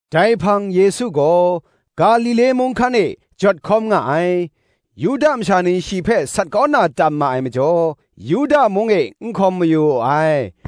Dai hpang Yesu gaw Galile mung hkan e jawt hkawm nga ai: Yuda masha ni shi hpe sat kau na tam ma ai majaw, Yuda mung e n hkawm mayu wu ai.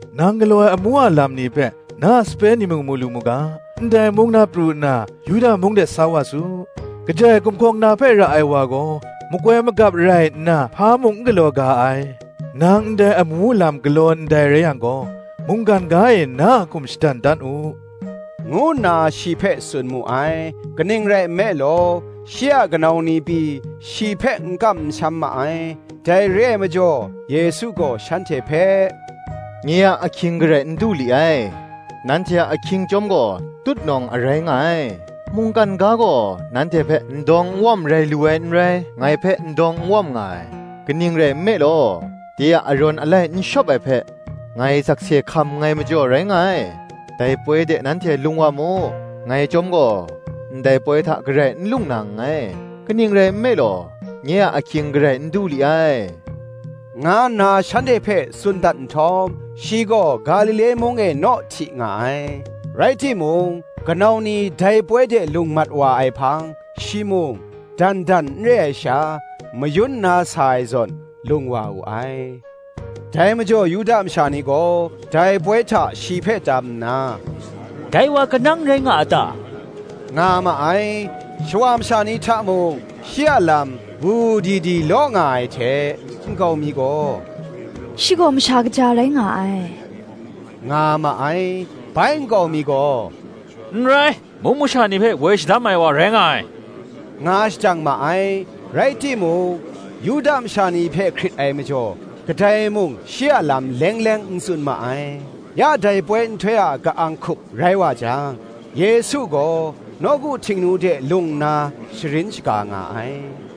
“Nang galaw ai amu a lam ni hpe na a sape ni mung mu lu mu ga, ndai mung na pru nna, Yuda mung de sa wa su: kajai gumhkawng na hpe ra ai wa gaw, makoi magap rai nna hpa mung n galaw ga ai. Nang ndai amu lam galaw ndai rai yang gaw, mungkan ga e na a hkum shadan dan u,” ngu nna shi hpe tsun mu ai. Kaning rai nme law, shi a kanau ni pyi shi hpe n kam n sham ma ai. Dai re ai majaw Yesu gaw shanhte hpe, “Nye a ahkying garai n du li ai; nanhte a ahkying chyawm gaw, tutnawng a rai nga ai. Mungkan ga gaw nanhte hpe n dawng n wawm rai lu ai n rai; ngai hpe n dawng n wawm nga ai: kaning rai nme law, de a arawn alai n shawp ai hpe, ngai sakse hkam nngai majaw rai nga ai. Dai poi de nanhte lung wa mu: ngai chyawm gaw ndai poi hta garai n lung na nngai: kaning rai nme law, nye a ahkying garai n du li ai,” nga nna shanhte hpe tsun dat nhtawm, shi gaw Galile mung e naw hti nga ai. Rai timung, kanau ni dai poi de lung mat wa ai hpang, shi mung, dan dan n re ai sha, mayun nna sa ai zawn, lung wa wu ai. Dai majaw Yuda masha ni gaw dai poi hta shi hpe tam nna, “Dai wa kanang rai nga a ta?” nga ma ai. Shawa masha ni hta mung shi a lam wu wu di di law nga ai hte, nkau mi gaw, “Shi gaw masha kaja rai nga ai,” nga ma ai; bai nkau mi gaw, “N rai, mung masha ni hpe woi shadam ai wa rai nga ai,” nga shajang ma ai. Rai timung, Yuda masha ni hpe hkrit ai majaw, kadai mung shi a lam leng leng n tsun ma ai. Ya dai poi nhtoi a ka-ang hkup rai wa jang, Yesu gaw nawku Htingnu de lung nna sharin shaga nga ai.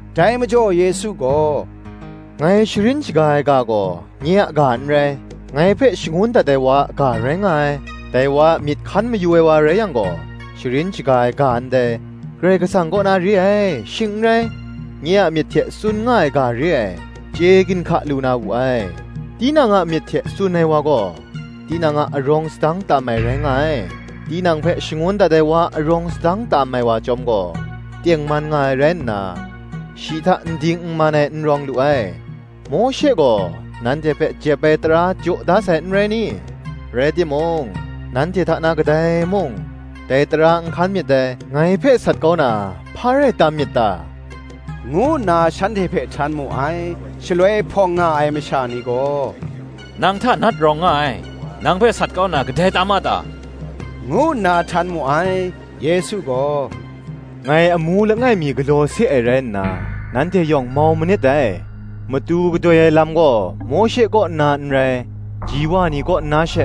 Dai majaw Yesu gaw, “Ngai sharin shaga ai ga gaw nye a ga n rai, ngai hpe shangun dat ai wa a ga rai nga ai: Dai wa a myit hkan mayu ai wa rai yang gaw, sharin shaga ai ga ndai, Karai Kasang kaw na re ai, shing n rai, nye a myit hte tsun nga ai ga re ai, chye ginhka lu na wu ai. Tinang a myit hte tsun ai wa gaw, tinang a arawng sadang tam ai rai nga ai: tinang hpe shangun dat ai wa a arawng sadang tam ai wa chyawm gaw, tengman nga ai rai nna, shi hta n ding n man ai n rawng lu ai. Mawshe gaw nanhte hpe jep ai tara jaw da sai, n rai ni? rai timung, nanhte hta na kadai mung, dai tara n hkan myit dai. Ngai hpe sat kau na hpa rai tam myit ta?” ngu nna shanhte hpe htan mu ai. Shaloi hpawng nga ai masha ni gaw, “Nang hta nat rawng nga ai: nang hpe sat kau na kadai tam a ta?” ngu nna htan mu ai. Yesu gaw, “Ngai amu langai mi galaw se ai rai nna, nanhte yawng mau manit dai. Matu gadoi ai lam gaw Mawshe kaw nna n rai, ji wa ni kaw nna she,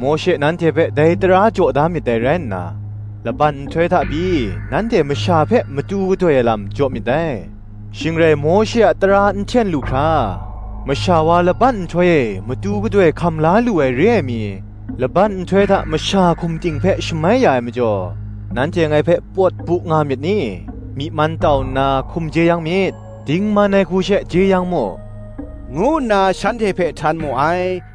Mawshe nanhte hpe dai tara jaw da myit dai rai nna, laban nhtoi hta pyi nanhte masha hpe matu gadoi ai lam jaw myit dai: shing rai Mawshe a tara n hten lu hkra, masha wa laban nhtoi e matu gadoi hkam la lu ai re ai mi, laban nhtoi hta masha hkum ting hpe shamai ya ai majaw, nanhte ngai hpe pawt bu nga myit ni? Myi man tau nna hkum jeyang myit, dingman ai hku she jeyang mu,” ngu nna shanhte hpe htan mu ai.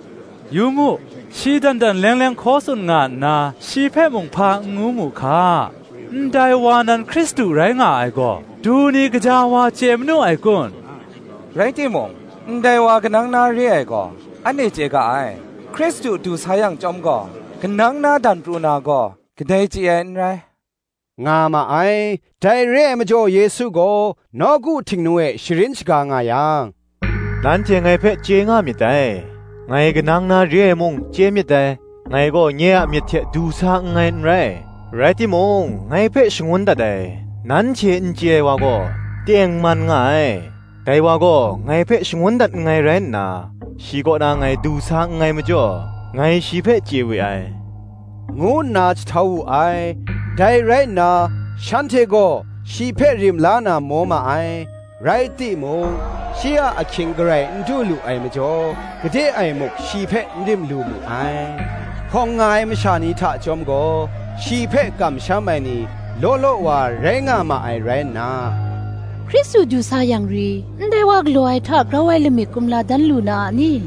Yu mu, shi dan dan leng leng hkaw tsun nga nna, shi hpe mung hpa n ngu mu hka: ndai wa nan Hkristu rai nga ai gaw, du ni gaja wa chye manu ai kun? Rai timung, ndai wa kanang na re ai gaw, anhte chye ga ai; Hkristu du sa yang chyawm gaw, kanang na dan pru na gaw, kadai chye ai n rai,” nga ma ai. Dai re ai majaw Yesu gaw nawku Htingnu e sharin shaga nga yang, “Nanhte ngai hpe chye nga myit dai; ngai kanang na re ai mung chye myit dai: ngai gaw nye a myit hte du sa nngai n rai; rai timung ngai hpe shangun dat ai, nanhte n chye ai wa gaw, tengman nga ai. Dai wa gaw ngai hpe shangun dat nngai rai nna, shi kaw na ngai du sa nngai majaw, ngai shi hpe chye we ai,” ngu nna jahtau wu ai. Dai rai nna shanhte gaw shi hpe rim la na maw ma ai; rai timung, shi a ahkying garai n du lu ai majaw, gade e muk shi hpe n rim lu mu ai. Hpawng nga ai masha ni hta chyawm gaw, shi hpe kamsham ai ni law law wa rai nga ma ai rai nna, Hkristu du sa yang ri, ndai wa galaw ai hta, grau ai lamik kumla dan lu na a ni?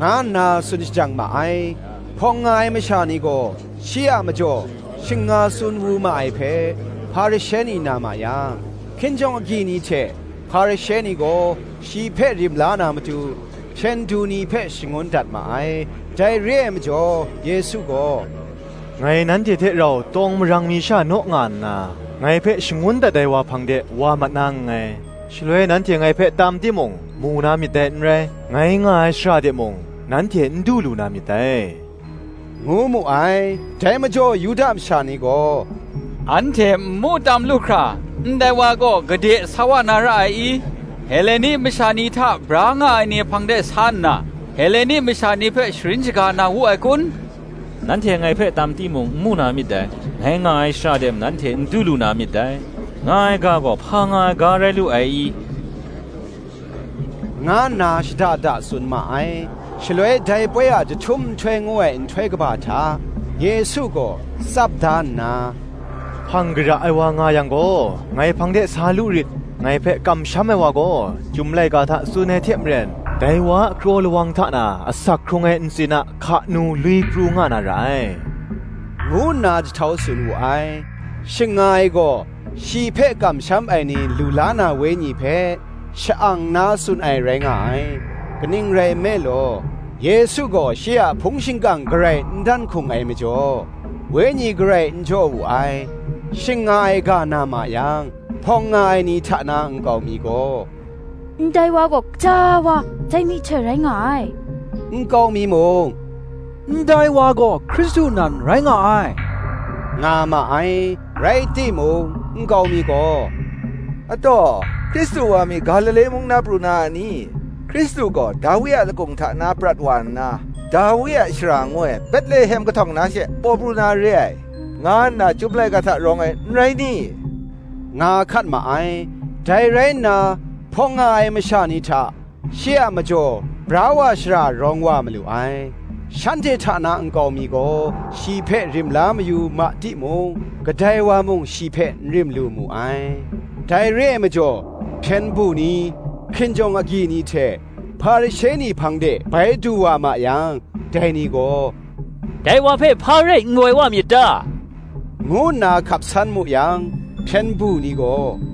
nga nna tsun shajang ma ai. Hpawng nga ai masha ni gaw, shi a majaw shing nga tsun wu ma ai hpe, Hparishe ni na ma yang, hkinjawng agyi ni hte Hparishe ni gaw, shi hpe rim la na matu, hpyen du ni hpe shangun dat ma ai. Dai re ai majaw Yesu gaw, “Ngai nanhte hte rau tawng marang mi sha naw nga nna, ngai hpe shangun dat ai wa hpang de wa mat na nngai: shaloi nanhte ngai hpe tam timung, mu na myit dai n rai: ngai nga ai shara de mung nanhte n du lu na myit dai,” ngu mu ai. Dai majaw Yuda masha ni gaw, “Anhte n mu tam lu hkra, ndai wa gaw gade sa wa na ra ai i? Heleni masha ni hta bra nga ai ni hpang de sa nna, Heleni masha ni hpe sharin shaga na wu ai kun? Nanhte ngai hpe tam timung n mu na myit dai; ngai nga ai shara de mung nanhte n du lu na myit dai, nga ai ga gaw hpa nga ai ga rai lu ai i?” nga nna shada da tsun ma ai. Shaloi dai poi a jahtum nhtoi ngu ai nhtoi kaba hta Yesu gaw tsap da nna, “Hpang kara ai wa nga yang gaw, ngai hpang de sa lu rit. Ngai hpe kamsham ai wa gaw, Chyum laika hta tsun ai hte maren, dai wa a kraw lawang hta na asak hkrung ai ntsin a hka nu lwi pru nga na ra ai,” ngu nna jahtau tsun wu ai. Shing nga ai gaw, shi hpe kamsham ai ni lu la na Wenyi hpe, sha-ang nna tsun ai rai nga ai: kaning rai nme law, Yesu gaw shi a hpung shingkang garai n dan hkung ai majaw, Wenyi garai n jaw wu ai. Shing nga ai ga na ma yang, hpawng nga ai ni hta na nkau mi gaw, “Ndai wa gaw gaja wa dai myihtoi rai nga ai:” nkau mi mung, “Ndai wa gaw Hkristu nan rai nga ai,” nga ma ai. Rai timung, nkau mi gaw, “Ataw! Hkristu wa mi Galile mung na pru na a ni? Hkristu gaw Dawi a lakung hta na prat wa nna, Dawi a shara ngu ai Betlehem kahtawng na she, paw pru na re ai, nga nna Chyum laika hta rawng ai, n rai ni?” nga hkat ma ai. Dai rai nna hpawng nga ai masha ni hta, shi a majaw bra wa shara rawng wa malu ai. Shanhte hta na nkau mi gaw shi hpe rim la mayu ma timung, kadai wa mung shi hpe n rim lu mu ai. Dai re ai majaw hpyen du ni, hkinjawng agyi ni hte Hparishe ni hpang de bai du wa ma yang, dai ni gaw, “Dai wa hpe hpa rai n woi wa myit ta?” ngu nna hkap san mu yang, hpyen du ni gaw,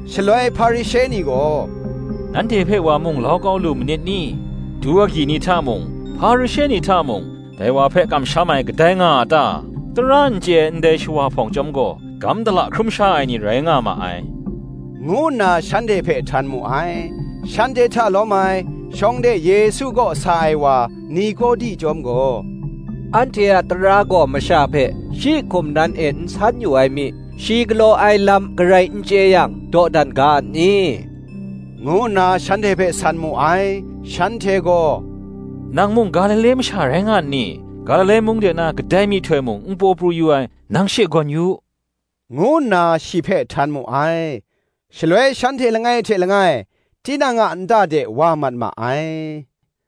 Shaloi Hparishe ni gaw, “Nanhte hpe wa mung lau kau lu manit ni? Du agyi ni hta na mung, Hparishe ni hta na mung, dai wa hpe kamsham ai kadai nga a ta? Tara n chye ai, ndai shawa hpawng chyawm gaw, dagam dala hkrum sha ai ni rai nga ma ai,” ngu nna shanhte hpe htan mu ai. Shanhte hta lawm ai, shawng de Yesu kaw sa ai wa Nikodi chyawm gaw, “Anhte a tara gaw masha hpe, shi hkum nan e n san yu ai mi, shi galaw ai lam garai n chye yang, dawdan ga a ni?” ngu nna shanhte hpe san mu ai. Shanhte gaw, “Nang mung Galile masha rai nga nni? Galile mung de na kadai myihtoi mung n paw pru yu ai, nang she gawn yu u,” ngu nna shi hpe htan mu ai. [Shaloi shanhte langai hte langai tinang a nta de wa mat ma ai: